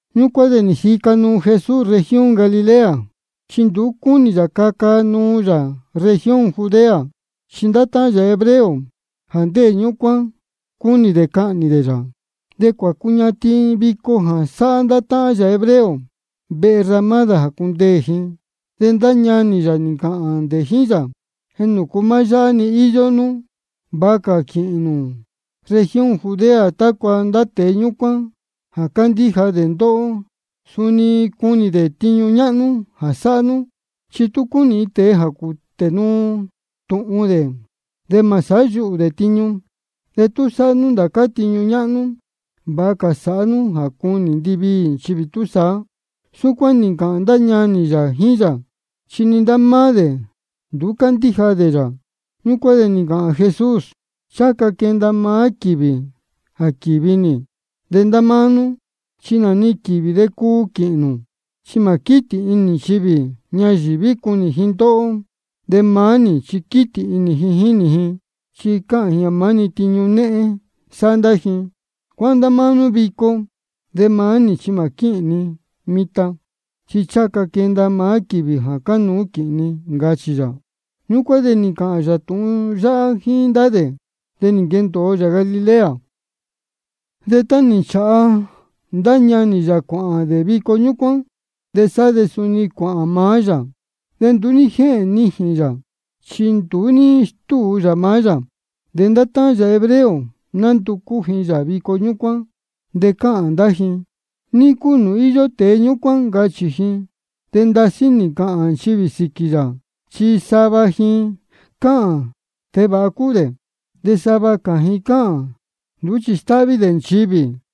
Ñúcuán de jíca nuu Jesús región Galilea. Chi nduú cúnī yā caca nuu yā región Judea, chi ndá táhán yā hebreo jā ndéē ñúcuán, cúnī dē cahnī dē yā. De cuācuñatin vico jā sāhá ndá táhán yā hebreo vehe ramádā jā cundeē ji. De ndá ñanī yā nī ncāhān dē jíín yā: ¿Nūcu maá yáhá-ni íyó nú? Vāha cā quīhīn nū región Judea, tácua ndá tēe ñúcuán jā cándíja dē ndóhó, suni cunī dē tiñu ñáhnú jā sáhá nú. Chi tú cúnī iin tēe jā cūtē nuu tūhun dē, de mā sāhá yuhū dē tiñu. De tú sáhá nú ndācá tiñu ñáhnú, vāha cā sāhá nú jā cunī ndiviī nchivī túsaá. Súcuán nī ncāhān ndá ñanī yā jíín yā, chi ni ndá máá dē nduú cándíja dē yā. Ñúcuán de nī ncāhān Jesús: Ncháha ca quenda maá quīvī jā quíhīn ni. De ndá máá nú chi nā-ni quīvī de cuu quīhīn nū. Chi mā quítī inī nchivī ñayīví cunī ji ndóhó, de maá nī chi quítī inī ji jínī ji, chi cáhān ni jā maá-ni tiñu néhén sáhá ndá ji. Cuáhán ndá máá nú vico. De maá nī chi mā quíhīn ni mitan, chi ncháha ca quenda maá quīvī jā cánuú quīhīn ni, ncachī yā. Súcuán nī ncāhān yā tūhun yáhá jíín ndá dē, de nī nquendōo yā Galilea. De tá nī nchāha ndá ñanī yā cuāhān dē vico ñúcuán, de sá de suni cuāhān maá yā. De nduú ní jéhēn nijīn yā, chi nduú ní stúu yā maá yā. De ndá táhán yā hebreo nánducú ji yā vico ñúcuán, de cáhān ndá ji: ¿Ní cúu nūū íyó tēe ñúcuán? ncachī ji. De ndasí nī ncāhān nchivī jā síquī yā, chi sava ji cáhān: Tēe vāha cúu dē. De sava cā ji cáhān: Nduú chi stáhví dē nchivī.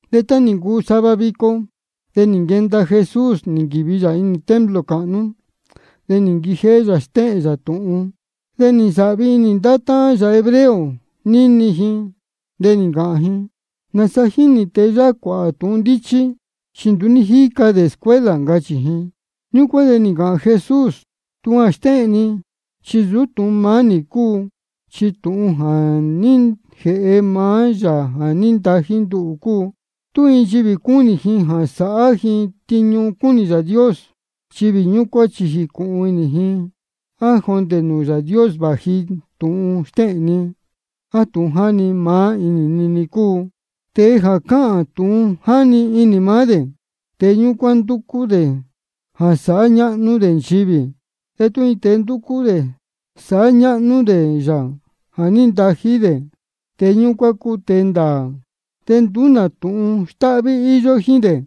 De tá nī ncuu sava vico, de nī nquenda Jesús, nī nquīvi yā templo cāhnú, de nī nquijéhé yā stéhēn yā tūhun. De nī nsāhvi inī ndá táhán yā hebreo níni ji, de nī ncāhān ji: ¿Nāsa jínī tēe yáhá cuāhā tūhun ndíchí? Chi nduú ní jíca dē escuela, ncachī ji. Ñúcuán de nī ncāhān Jesús: Tūhun jā stéhēn ni chi nsūú tūhun maá nī cúu, chi tūhun jā ní jēhe maá Yāā jā ní ntají nduhū cúu. Tú iin nchivī cúnī ji sāhá ji tiñu cúnī Yāā Dios, nchivī ñúcuán chi jīcūhun inī ji á jondē nūū Yāā Dios vāji tūhun stéhēn ni, á tūhun jā jáni inī maá nī cúu. Tēe jā cáhān tūhun jáni inī maá dē, tēe ñúcuán ndúcú dē jā sāhá ñáhnú nchivī dē. De tú iin tēe ndúcú dē sāhá ñáhnú dē Yāā jā ní ntají dē, tēe ñúcuán cúu tēe ndāā, de nduú nā tūhun stáhví íyó jíín dē.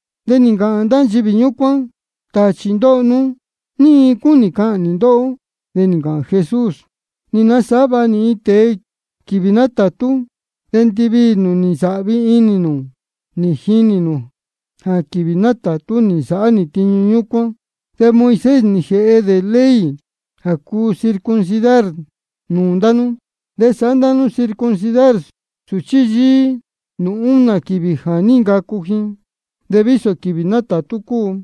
De nī ncāhān ndá nchivī ñúcuán: Tāchī ndóho nú. ¿Ní iin cúnī cahnī ndóhó? De nī ncāhān Jesús: Nī nasāhá vāha nī iin tēe quīvī nátātú, de ndiviī nū nī nsāhvi inī nū nī jinī nū jā quīvī nátātú nī nsāhá nī tiñu ñúcuán. De Moisés nī jēhe dē ley jā cúu circuncidar nūū ndá nú. De sáhá ndá nú circuncidar sūchí yíí nūū únā quīvī jā ní ncacu ji, vísō quīvī nátātú cúu.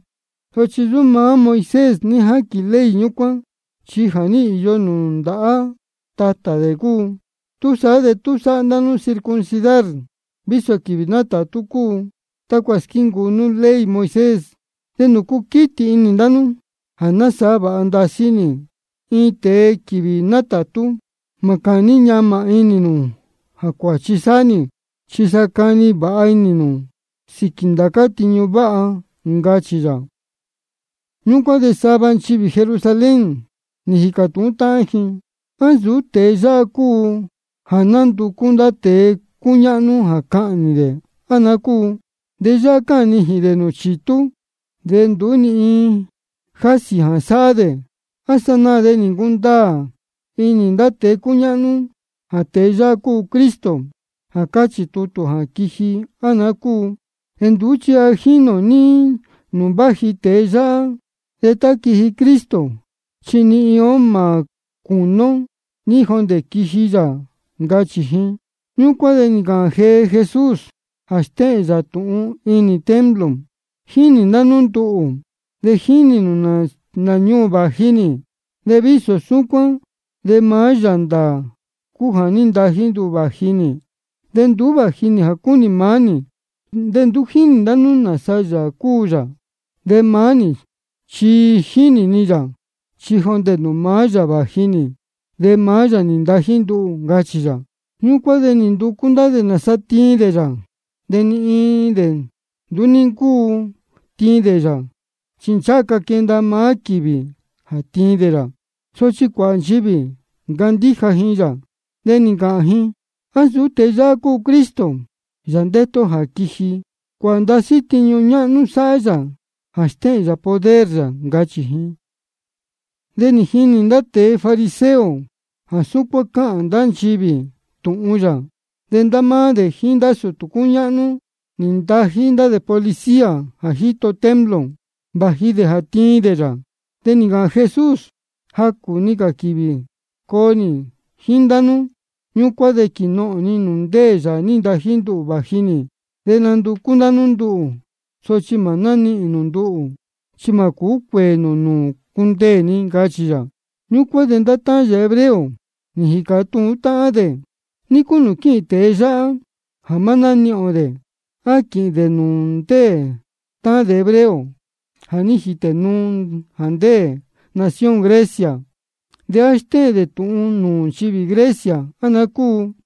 (Sochi nsūú maá Moisés ní jáquīn ley ñúcuán, chi ja nī īyo nūū ndācá tatā dē.) Túsaá de tú sáhá ndá nú circuncidar vísō quīvī nátātú cúu, tácua squíncuu nú ley Moisés, ¿de nūcu quítī inī ndá nú jā ní nasāhá vāha ndasí nī iin tēe quīvī nátātú? Mā cāní ñamā inī nū jā cuāchi sáhá nī. Chi sa cani vāha inī nū sīquī ndācá tiñu váha, ncachī yā. Ñūcuán de sava nchivī Jerusalén nī jīcā tūhún táhán ji: ¿A nsūú tēe yáhá cúu jā nánducú ndá tēe cúñáhnú jā cahnī dē, á naá cúu? De yáhá cáhān nijīn dē nūū chitú, de nduú ni iin jásī jā sáhá dē. ¿A sanaā de nī ncundaā inī ndá tēe cúñáhnú jā tēe yáhá cúu Cristo jā cáchī tutū jā quiji, á naá cúu? De nduú chi ja jínī ō ní nūū váji tēe yáhá. De tá quiji Cristo, chi ni iin ó mā cúnī ō ní jondē quiji yā, ncachī ji. Ñúcuán de nī ncāhān jee Jesús jā stéhēn yā tūhun inī templo: Jínī ndá nú nduhū, de jínī nū nā ñuū vāji nī. De vísō súcuán de maá Yāā ndāā cúu jā ní ntají nduhū vāji nī, de nduú vāji nī jā cúnī maá nī. De nduú jínī ndá nú nāsa Yāā cúu yā. De maá nī chi jínī ni yā, chi jondē nūū maá yā vāji nī, de maá yā nī ntají nduhū, ncachī yā. Ñúcuán de nī nducú ndá dē tiin dē yā. De ni iin dē nduú ní ncúu tiin dē yā, chi ncháha ca quenda maá quīvī jā tiin dē yā. Sochi cuāhā nchivī nī ncandíja ji yā, de nī ncāhān ji: ¿A nsūú tēe yáhá cúu Cristo, Yāā ndétu ó jā quiji? Chi cuāhā ndasí tiñu ñáhnú sáhá yā jā stéhēn yā poder yā, ncachī ji. De nī jinī ndá tēe fariseo jā súcuán cáhān ndá nchivī tūhun yā. De ndá máá dē jíín ndá sūtū cúñáhnú, nī ntají dē ndá policía jā jíto templo, vāji dē jā tiin dē yā. De nī ncāhān Jesús: Jacū-ni cā quīvī coo nī jíín ndá nú. Ñúcuán de quīnohōn ni nūū Yāā nī ntají nduhū vāji nī. De nanducú ndá nú nduhū, sochi mā nánihīn nū nduhū. Chi mā cūú cuēē nū nūū cundeē ni, ncachī yā. Ñúcuán de ndá táhán yā hebreo nī jīcā tūhún táhán dē: ¿De ní cúu nūū quíhīn tēe yáhá jā mā nánihīn ō dē? ¿A quīhīn dē nūū ndá táhán ó hebreo jā ní jītē nuu jā ndéē nación Grecia? ¿De á stéhēn dē tūhun nūū nchivī Grecia, á naá cúu?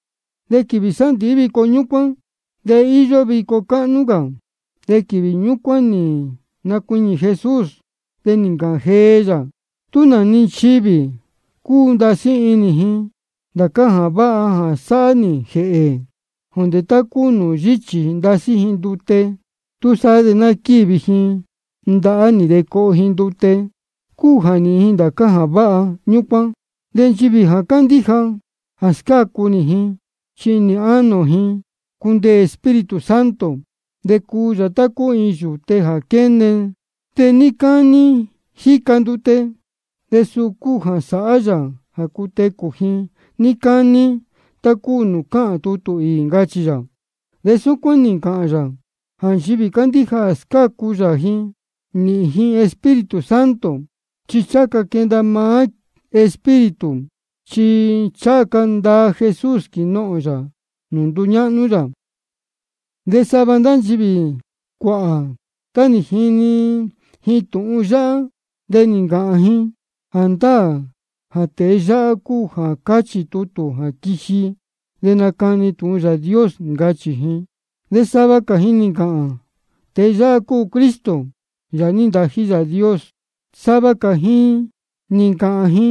De quīvī sándīhí vico ñúcuán de íyó vico cáhnú cā. De quīvī ñúcuán nī nacuiñī Jesús, de nī ncāhān jee yā: Tú nā-ni nchivī cúu ndasí inī ji ndācá jā váha jā sāhá nī jēhē ji, jondē tá cúu nūū yíchī ndasí ji ndute, túsaá de ná quívi ji ndahá nī de coho ji ndute, cúu jā nīhīn ji ndācá jā váha ñúcuán. De nchivī jā candíja jā scácu nī ji, chi inī ánō ji cundeē Espíritu Santo, de cuu yā tá cúu iin yūte jā quéne de níí cání jíca ndute. De suu cúu jā sāhá yā jā cutecū ji níí cání, tá cúu nūū cáhān tutū īī, ncachī yā. De súcuán nī ncāhān yā jā nchivī candíja jā scácu yā ji, nīhīn ji Espíritu Santo. Chi ncháha ca quenda maá Espíritu, chi ncháha ca ndaa Jesús quīnohōn yā nūū nduñáhnú yā. De sava ndá nchivī cuāhā, tá nī jini ji tūhun yáhá, de nī ncāhān ji: Jāndáā jā tēe yáhá cúu jā cáchī tutū jā quiji dē nacani dē tūhun Yāā Dios, ncachī ji. De sava cā ji nī ncāhān: Tēe yáhá cúu Cristo, Yāā nī ntají Yāā Dios. Sochi sava cā ji nī ncāhān ji: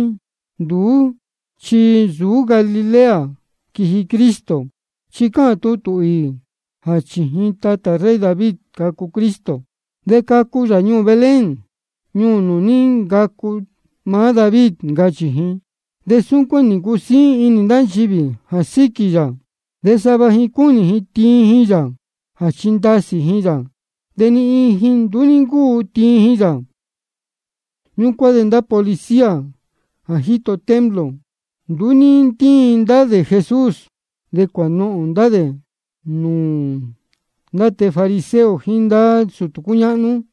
Nduú chi nsūú Galilea quiji Cristo. Chi cáchī tutū īī jā chījin tatā rey David cacu Cristo, de cacu yā ñuū Belén, ñuū nūū ní ncacu maá David, ncachī ji. De súcuán nī ncusíín inī ndá nchivī jā síquī yā. De sava ji cúnī ji tiin ji yā jā chindasī ji yā, de ni iin ji nduú ní ntíin ji yā. Ñúcuán de ndá policía jā jíto templo, nduú ní ntíin ndá dē Jesús, de cuānohōn ndá dē nūū ndá tēe fariseo jíín ndá sūtū cúñáhnú.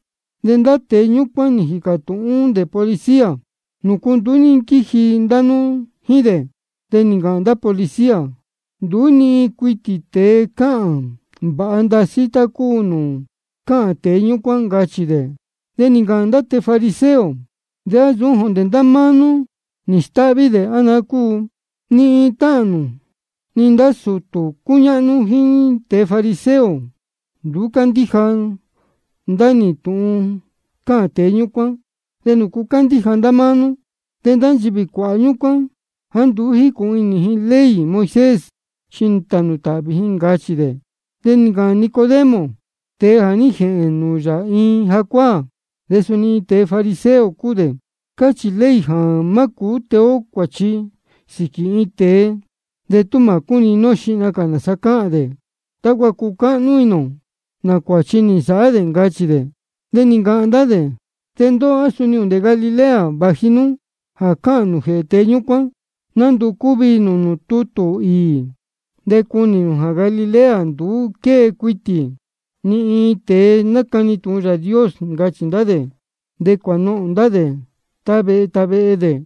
De ndá tēe ñúcuán nī jīcā tūhún dē policía: ¿Nūcu nduú ní nquíji ndá nú jíín dē? De nī ncāhān ndá policía: Nduú cuitī ni iin tēe cáhān vāha ndasí tá cúu nūū cáhān tēe ñúcuán, ncachī dē. De nī ncāhān ndá tēe fariseo: ¿De á suni jondē ndá máá nú nī stáhví dē, á naá cúu? Ni iin táhán nī ndá sūtū cúñáhnú jíín tēe fariseo, nduú cándíja ndá nī tūhun cáhān tēe ñúcuán, ¿de nūcu cándíja ndá máá nú? De ndá nchivī cuāhā ñúcuán jāá nduú jícūhun inī ji ley Moisés, chi tānū tāhvī ji, ncachī ndá dē. De nī ncāhān Nicodemo, tēe jā ní jēhēn nūū yā iin jacuáā, de suni iin tēe fariseo cúu dē: Cáchī ley jā má cūú tee ó cuāchi sīquī iin tēe, de tú mā cúnini ó xihna cā nāsa cáhān dē, tácua cucáhnú inī ō nā cuāchi nī nsāhá dē, ncachī dē. De nī ncāhān ndá dē: De ndóhó, ¿á suni jondē Galilea vāji nú jā cáhān nū jēhē tēe ñúcuán? Nanducú viī nū nūū tutū īī de cunī nū jā Galilea nduú quée cuitī ni iin tēe nácani tūhun Yāā Dios, ncachī ndá dē. De cuānohōn ndá dē tá vehe tá vehe dē.